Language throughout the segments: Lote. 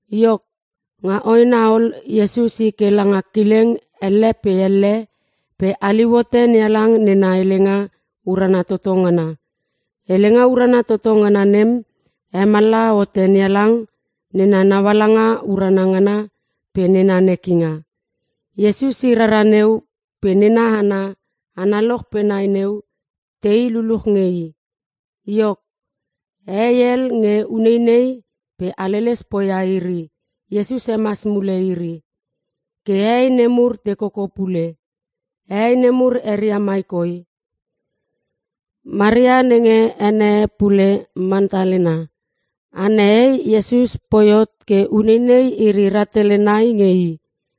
Iok, nga hoena ol Iesus i ke langa kileng elle pe elle pe haliu hote NeHalang nena helenga urana toto ngana. Helenga urana toto ngana nem hemallaha hote NeHalang nena naualanga urana ngana pe nena nekinga. Iesus i rara neu pe nena hana analoch pe nai neu tei luluch nge i. Iok, hehei hel nge uneinei pe haleles poia iri Iesus hemas mule iri. Ke hehei nemur te koko pule. Hehei nemur eria mai koi: Maria (nenge ene e pule Mantalena) Ana hei Iesus poi hot ke uneinei iri rahtele nai nge i.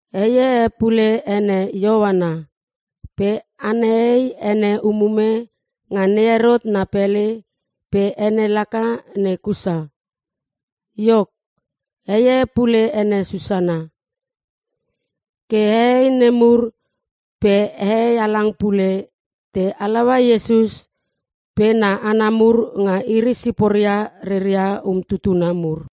Hei e pule ene Ioana. Pe ana hei ene umume nga NeHerot na pele pe ene laka ne Kusa. Iok, hei e pule ene Susana. Ke hehei nemur pe hehei halang pule te halaua Iesus pe na hana mur nga iri siporia reria umtutuna mur.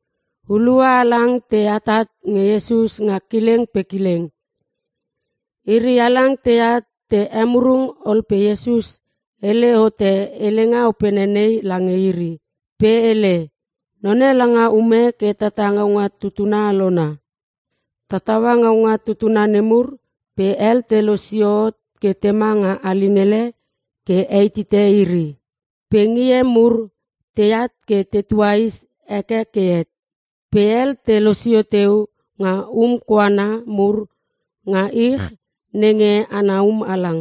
Hulua halang te atat nge Iesus nga kileng pe kileng. Iri halang teat te emurung ol pe Iesus hele hote helenga opene nei lange iri. Pe hele, “None langa ume ke tata ngaunga tutuna alona. Tataua ngaunga tutuna nemur pe hel te losio hot ke tema nga alingele ke heitite iri pe ngie mur teat ke te tuais heke ke het. Pe hel te losio teu nga um koana mur nga ich nenge ana um halang.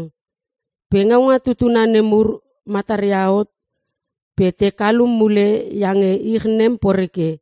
Pe ngaunga tutuna nemur mataria hot pe te kalum mule iange ich nem poreke.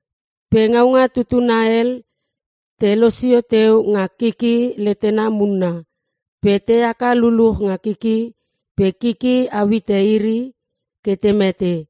Pe ngaunga tutuna hel te losio teu nga kiki letena munna pe te haka luluch nga kiki pe kiki au hite iri ke te mete.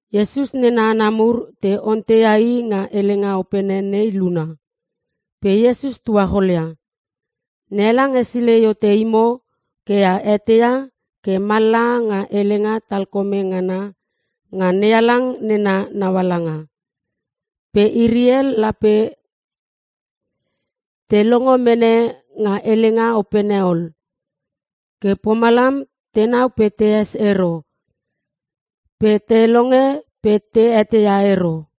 Iesus nena hana mur te onteia i nga helenga opene nei luna. Pe Iesus tuacholia, “NeHalang hesilei hote imo ke a eteia ke mallaha nga helenga talkome ngana nga NeHalang nena naualanga. Pe iri hel lape te longo mene nga helenga opene ol. Ke pomalam, “‘Tenau pe tees ero. Pe te longe pe te eteia ero.’”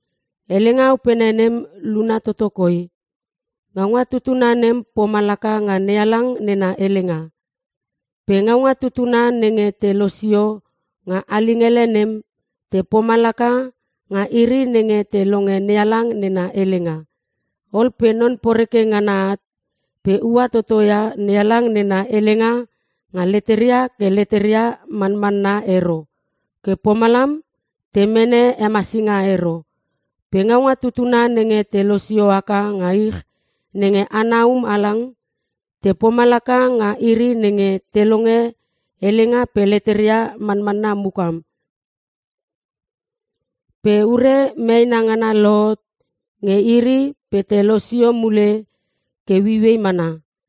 “Helenga opene nem luna toto koi: Ngaunga tutuna nem pomalaka nga NeHalang nena helenga. Pe ngaunga tutuna nenge te losio nga alingele nem te pomalaka nga iri nenge te longe NeHalang nena helenga. Ol pe Non Poreke ngana at pe ua toto ia NeHalang nena helenga nga leteria ke leteria manmanna ero ke pomalam te mene hemasinga ero. Pe ngaunga tutuna nenge te losio haka nga ich nenge ana um halang te pomalaka nga iri nenge te longe helenga pe leteria manmanna mukam pe ure meena ngana lohot nge iri pe te losio mule ke ueiuei mana.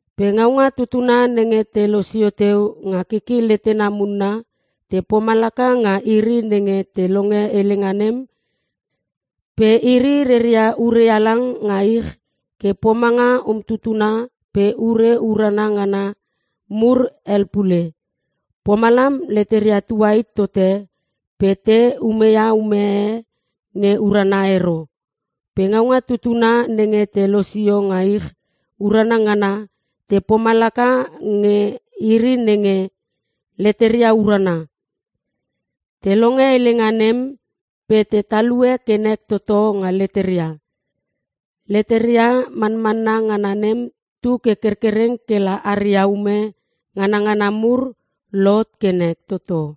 Pe ngaunga tutuna nenge te losio teu nga kiki letena munna te pomalaka nga iri nenge te longe helenga nem pe iri reria ure halang nga ich ke pomanga umtutuna pe ure urana ngana mur hel pule. Pomalam leteria tuit tote pe te umeia ume e nge urana ero. Pe ngaunga tutuna nenge te losio nga ich urana ngana te pomalaka nge iri nenge leteria urana. Te longe helenga nem pe te talue ke nek toto nga leteria. Leteria manmanna ngana nem tu ke kerkereng kela aria ume nganangana mur lohot ke nek toto.”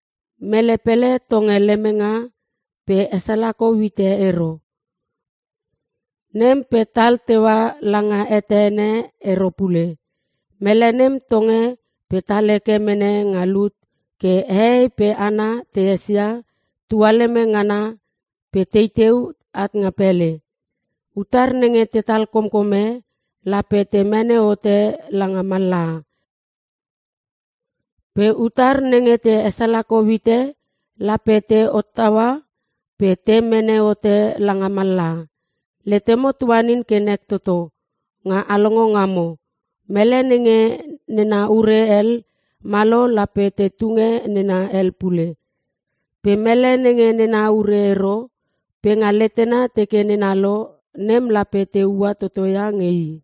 “Mele pele tonge lemenga pe hesalakou hite ero. Nem pe tal teua langa hete ene ero pule. Mele nem tonge pe tal heke mene nga lut ke hehei pe hana te esia tualeme ngana pe teteu at nga pele. Utar nenge tetal komkome lape te mene hote langa mallaha. Pe utar nenge te esalakou hite lape te hottaua pe te mene hote langa mallaha. Letemo tuanin ke nek toto nga a longo ngamo. Mele nenge nena ure hel malo lape te tunge nena hel pule. Pe mele nenge nena ure ero pe nga letena teke nena lo nem lape te ua toto ia nge i.”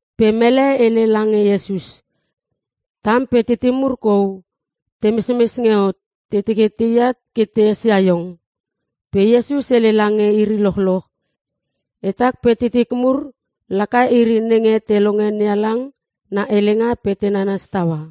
Pe mele hele lange Iesus, “Tam pe titim mur kou te mesmes nge hot te teke teat ke te esia iong.” Pe Iesus hele lange iri lochloch, “Etak pe titik mur laka iri nenge te longe NeHalang na helenga pe te nanas taua.”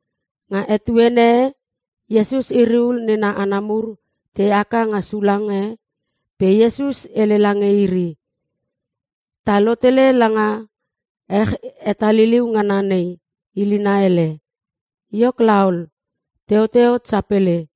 Nga etuene e Iesus iri ul nena hana mur te haka nga sulang e pe Iesus hele lange iri, “Ta lotele langa ech hetaliliu ngana nei ilina hele.” Iok laol, teote hot sapele.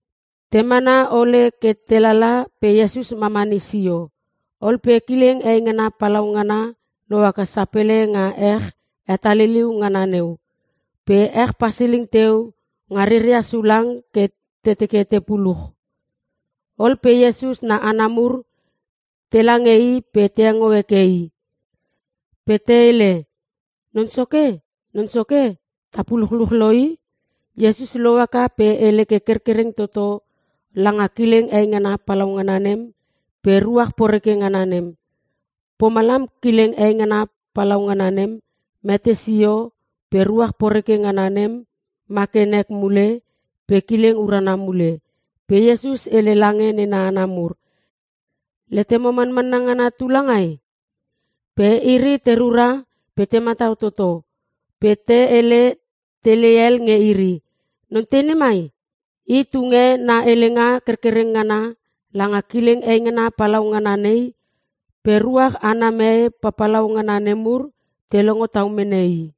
Te mana ole ke te lala pe Iesus mamani sio. Ol pe kileng eingana palaungana lohaka sapele nga ech hetaliliu ngana neu. Pe ech pasiling teu nga reria sulang ke te teke te puluch. Ol pe Iesus na hana mur telange i pe te engo heke i. Pe te hele, “Non Soke! Non Soke! Ta puluchluch lo i!” Iesus lohaka pe hele ke kerkereng toto langa kileng eingana palaungana nem pe ruach poreke ngana nem. Pomalam kileng eingana palau ngana nem mete sio pe ruach poreke ngana nem ma ke nek mule pe kileng urana mule. Pe Iesus hele lange nena hana mur, “Letemo manmanna ngana tu langai?” Pe iri te rura pe te matau toto pe te hele tele hel nge iri, “Non tei nemai? I tunge na helenga kerkereng ngana langa kileng eingana palau ngana nei pe ruach ana mee papalau ngana nemur pe te longo tau mene i!”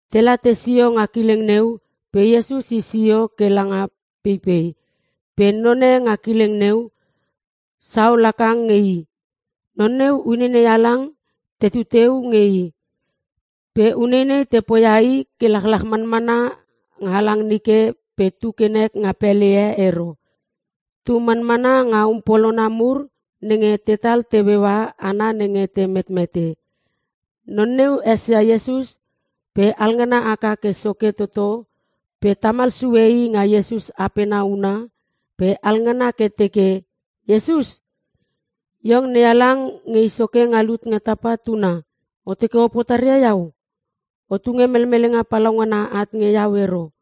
Tela tesio nga kileng neu pe Iesus i sio ke langa peipei. Pe none nga kileng neu saol haka nge i. Non neu uneinei halang tetu teu nge i. Pe uneinei te poia i ke lachlach manmana nga halang nike pe tu ke nek nga pele e ero. Tu manmana nga um polona mur nenge tetal teueua hana nenge te metmete. Non neu esia Iesus pe halngana haka ke soke toto pe tamal sue i nga Iesus apena huna pe alngana ke teke, “Iesus! Iong NeHalang Nge I Soke Nga Lut Nga Tapa Tuna! O teke o potaria iau? O tunge melmelenga palaungana at nge iau ero!”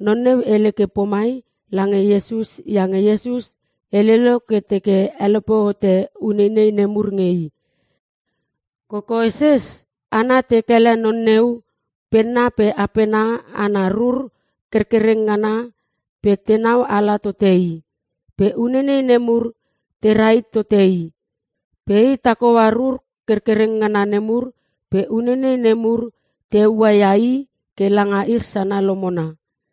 Non neu hele ke pomai lange Iesus iange Iesus hele lo ke teke helope hote uneinei nemur nge i. (Kokoeses hana te kele non neu penna pe apena ana rur kerkereng ngana pe tenau ala tote i. Pe uneinei nemur tera hit tote i. Pe i tak hoa rur kerkereng ngana nemur pe uneinei nemur te heua ia i ke langa ich sana lomona.)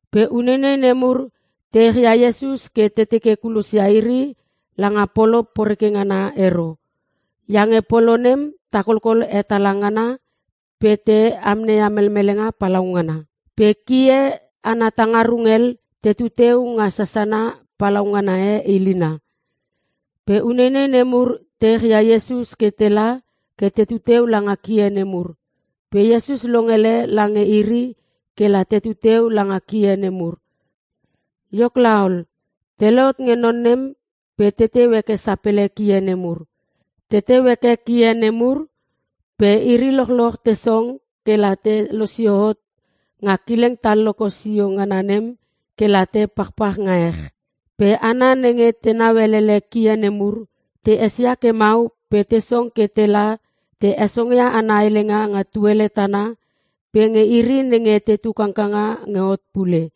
Pe uneinei nemur te echia Iesus ke te teke kulosia iri langa polo poreke ngana ero. Iange polo nem takolkol hetala ngana pe te amneia melmelinga palaungana. Pe kie ana tuangarung hel te tutua nga sasana palaungana e ilina. Pe uneinei nemur te echia Iesus ke tela ke teteu langa kie nemur. Pe Iesus longele lange iri ke la teteu langa kie nemur. Iok laol, te lohot nge non nem pe teteu heke sapele kie nemur. Teteu heke kie nemur pe iri lochloch te song kela te losio hot nga kileng talloko sio ngana nem kela te pachpach nga ech. Pe hana nenge tenau elele kie nemur te esia ke mau pe te song ke la te hesongia ana helenga nga tuele tana pe nge iri nenge tetu kangkanga nge hot pule.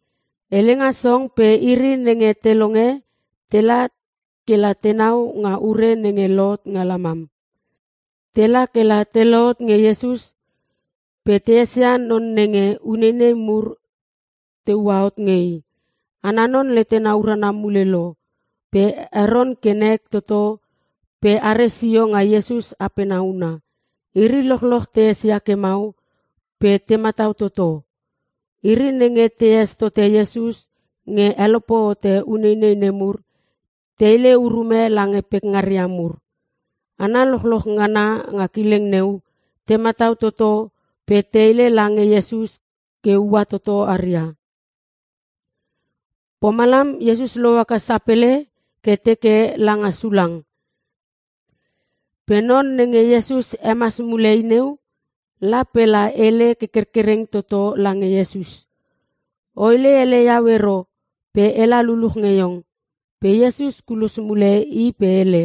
Helenga song pe iri nenge te longe tela kela tenau nga ure nenge lohot nga lamam. Tela kela te lohot nge Iesus pe te esia non nenge uneinei mur te ua hot nge i. Ana non letena urana mule lo pe heron ke nek toto pe are sio nga Iesus apena una. Iri lochloch te esia ke mau pe te matau toto. Iri nenge tees tote Iesus nge helope hote uneinei nemur te hele urume lange pekngaria mur. Hana lochloch ngana nga kileng neu te matau toto pe te hele lange Iesus ke ua toto aria. Pomalam Iesus lohaka sapele ke teke langa sulang. Pe non nenge Iesus hemas mule i neu la pe la hele ke kerkereng toto lange Iesus, “O hele ele iau ero pe ela luluch nge iong.” Pe Iesus kulos mule i pe hele,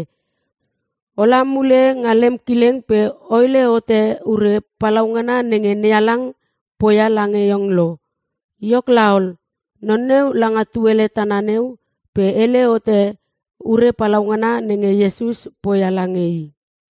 “Ola mule nga lem kileng pe o hele hote ure palaungana nenge NeHalang poia lange iong lo.” Iok laol, non neu langa tuele tana neu pe hele hote ure palaungana nenge Iesus poia lange i.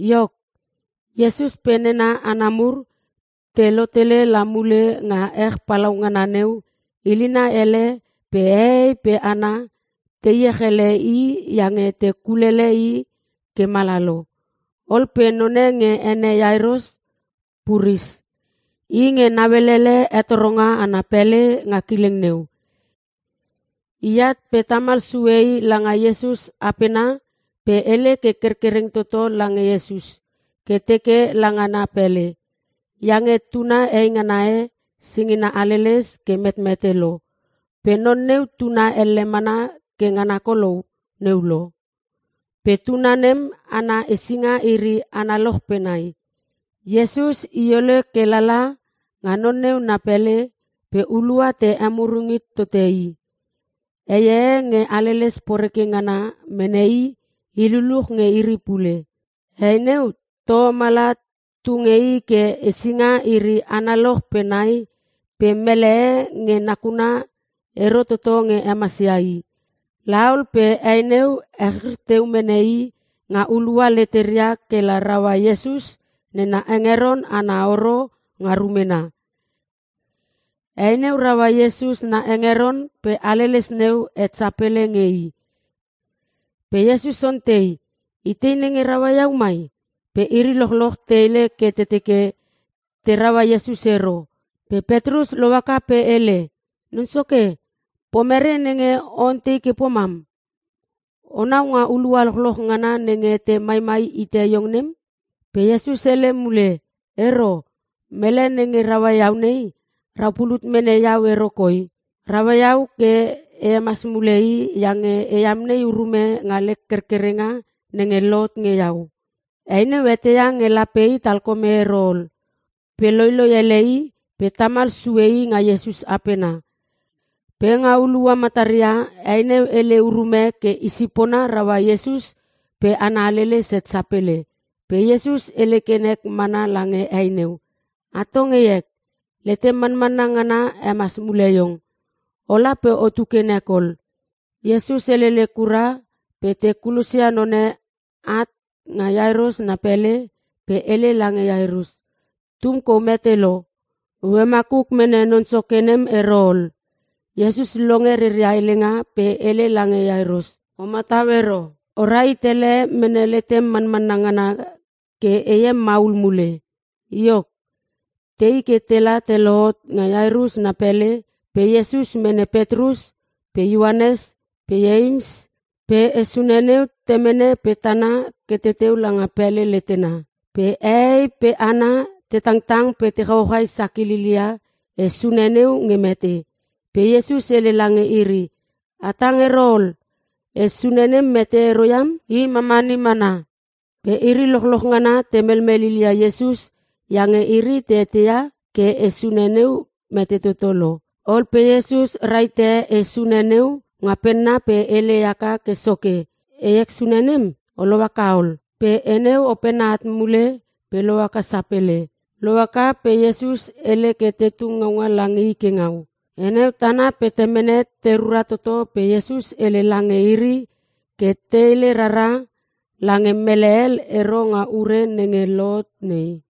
Iok, Iesus pe nena hana mur te lotele la mule nga ech palaungana neu ilina ele pe hehei pe hana te iech ele i iange te kulele i ke mala lo. Ol pe none nge ene Iairos puris. I nge nauelele hetoronga ana pele nga kileng neu. I at pe tamal sue i langa Iesus apena pe hele ke kerkereng toto lange Iesus ke teke langa na pele, iange tuna heingana e singina haleles ke metmete lo. Pe non neu tuna elle mana ke ngana kolou neu lo. Pe tuna nem ana hesinga iri analoch pe nai. Iesus i ole ke lala nga non neu na pele pe hulua te emurung hit tote i. Hei e nge haleles poreke ngana mene i ii luluch nge iri pule. Hei neu toho mala tu nge i ke hesinga iri analoch pe nai pe mele e nge nakuna ero toto nge hemasia i. La ol pe hei neu echrir teu mene i nga hulua leteria kela raua Iesus nena hengeron ana horo nga rumena. Hei neu raua Iesus na hengeron pe haleles neu het sapele nge i. Pe Iesus ontei, “Itei nenge raua iau mai?” Pe iri lochloch te hele ke te teke te raua Iesus ero. Pe Petrus lohaka pe hele, “Non Soke pomere nenge o ontei ke pomam? Onau nga hulua lochloch ngana nenge te maimai hite iong nem.” Pe Iesus hele mule, “Ero, mele nenge raua iau nei rau pulut mene iau ero koi. Raua iau ke e hemas mule i iange e amnei urume nga lek kerkerenga nenge lohot nge iau.” Hei neu eteia nge lape i talkome ero ol pe loiloi ele i pe la tamal sue i nga Iesus apena. Pe nga hulua mataria hei neu hele urume ke i sipona raua Iesus pe ana haleles het sapele. Pe Iesus hele ke nek mana lange hei neu, “Atong heek, letem manmanna ngana hemas mule iong. Ola pe otu ke nek ol.” Iesus helele kura pe te kulosia none at nga Iairus na pele pe hele lange Iairus, “Tum kou mete lo. O hemakuk mene non soke nem ero ol.” Iesus longe reria helenga pe hele lange Iairos, “O matau ero. O rahit ele mene letem manmanna ngana ke heem maul mule.” Iok, tei kela te lohot nga Iairus na pele pe Iesus mene Petrus pe Ioanes pe Ieims pe he sune neu temene pe tana ke teteu langa pele letena. Pe hehei pe hana te tangtang pe te chauchai sakililia he sune neu nge mete. Pe Iesus hele lange iri, “A tang ero ol. He sune nem mete ero iam. I mamani mana!” Pe iri lochloch ngana te melmel lilia Iesus iange iri te eteia ke he sune neu mete toto lo. Ol pe Iesus rahite he sune neu nga penna pe hele haka ke soke, “Heek sune nem, o lohaka ol!” Pe he neu opene at mule pe lohaka sapele. Lohaka pe Iesus hele ke te tung ngaunga lange i ke ngau. He neu tana pe temene te rura toto pe Iesus hele lange iri ke te hele rara lange mele hel ero nga ure nenge lohot nei.